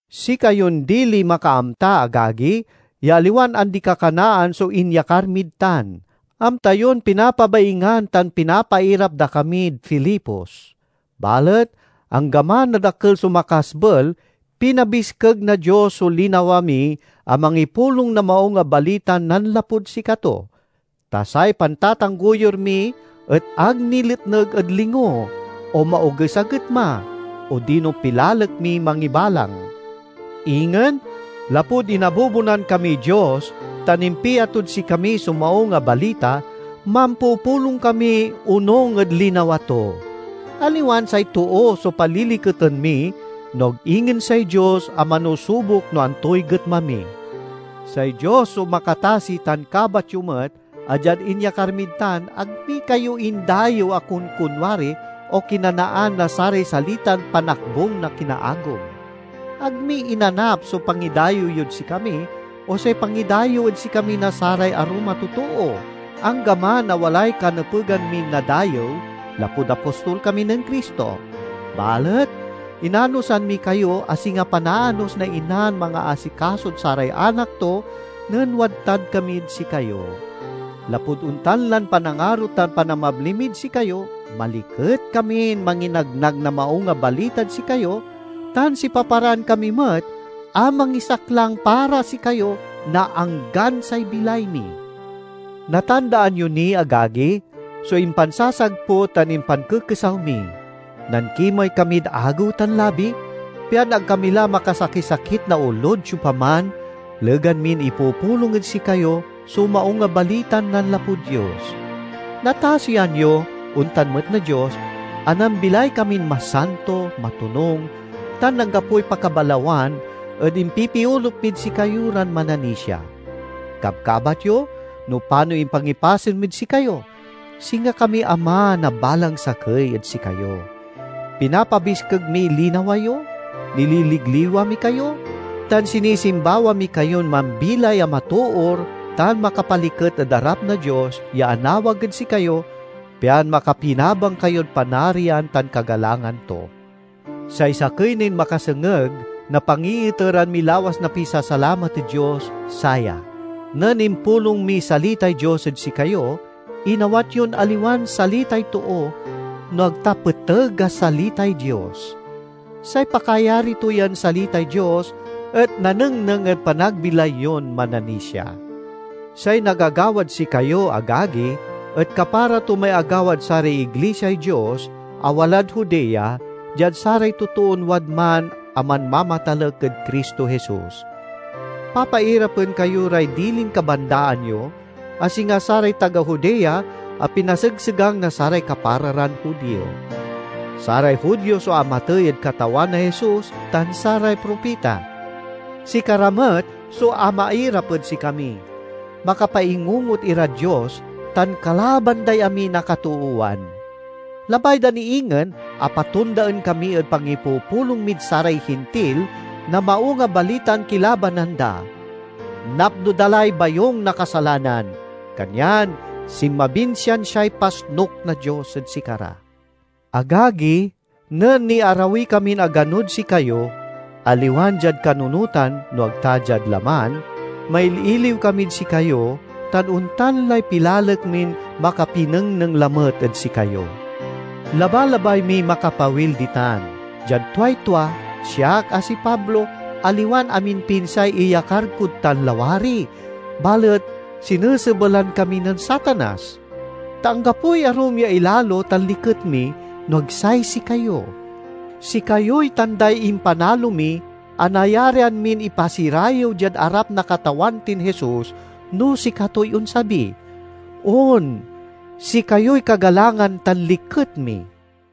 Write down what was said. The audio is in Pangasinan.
Sikayon diliy makaamta, agagi, ya aliwan andi-kakanaan so inyakar mid tan. Amta yon pinapabaingan tan pinapairap da kamid Filipos. Balet anggaman a dakel so makasbel, pinabiskeg na Dios so linawa mi a mangipulong na Maung a Balitan nanlapud sikato. Ta say pantatanggoyur mi et ag niletneg ed lingo, o maoges a getma, odino pilalek miy mangibalang. Ingen, lapud inabubonan kamiy Dios tan impia tod sikami so Maung a Balita, mampupulong kami onung ed linawa to. Aliwan say too so paliliketen mi, no ag ingen say Dios a manusubok no antoy getma mi. Say Dios so makatasi tan kabat yo met a diad inyakar mid tan, ag mi kayo indayew a konkonwari o kinanaan na saray salitan panakbung na kinaagom. Ag mi inanap so pangidayew yod sikami o say pangidayew ed sikami na saray arum a totoo, anggaman a walay kanepegan min nadayew, lapud apostol kami nen Cristo. Balet inanosan mi kayo a singa panaanos na inan mangaasikasod saray anak to nen wadtan kamid sikayo. Lapud ontan lan panangaro tan panamabli mid sikayo, maliket kamin manginagnag na Maung a Balitad sikayo tan sipaparaan kami met a mangisaklang para sikayo na anggan say bilay mi. Natandaan yo ni, agagi, so impansasagput tan impankekesaw mi; nankimey kamid agew tan labi pian ag kami la makasakisakit na olod siopaman legan min ipupulong ed sikayo so Maung a Balitan nanlapud Dios. Natasian yo, ontan met na Dios, a nambilay kamin masanto, matonung, tan anggapoy pakabalawan ed impipiolup mid sikayo ran mananisia. Kabkabat yo no panoy impangipasen mid sikayo; singa kami ama na balang sakey ed sikayo. Pinapabiskeg miy linawa yo, nililigliwa mi kayo, tan sinisimbawa mi kayon mambilay a matoor tan makapaliket ed arap na Dios ya anawag ed sikayo, pian makapinabang kayod Panarian tan kagalangan to. Say sakey nin makasengeg na pangiiteran mi lawas na pisasalamat ed Dios, saya: nen impulong miy salitay Dios ed sikayo inawat yon aliwan salitay too, no ag ta peteg a salitay Dios. Say pakayari to yan salitay Dios et nanengneng ed panagbilay yon mananisia. Say nagagawad sikayo, agagi, et kapara to may agawad saray iglisiay Dios a walad Judea, diad saray totoon wadman a manmamatalek ed Cristo Jesus. Papairapen kayo ray dilin kabandaan yo, a singa saray taga Judea a pinasegsegang na saray kapara ran Judio. Saray Judio so amatey ed Katawan a Jesus tan saray propita. Sikara met so amairap ed sikami. Makapaingungot irad Dios tan kalaban day amin a katoowan! Labay da ni ingen a patondaen kami ed pangipupulong mid saray Hintil na Maung a Balitan kilabanan da. Napno da lay bayung na kasalanan, kanyan sinmabin siansiay pasnuk na Dios ed sikara! Agagi, nen niarawi kamin aganod sikayo—aliwan diad kanunotan no ag ta diad laman—maililiw kamid sikayo tan ontan lay pilalek min makapinengneng lamet ed sikayo! Labalabay miy makapawil ditan. Diad tuay tua, siak, a si Pablo, aliwan aminpinsay iyakar kod tan lawari, balet sinesebelan kami nen Satanas. Ta anggapoy arum ya ilalo tan liket mi, no ag say sikayo. Sikayoy tanday impanalo mi a nayarian min ipasirayew diad arap na Katawan tin Jesus no sikatoy onsabi. On, sikayoy kagalangan tan liket mi!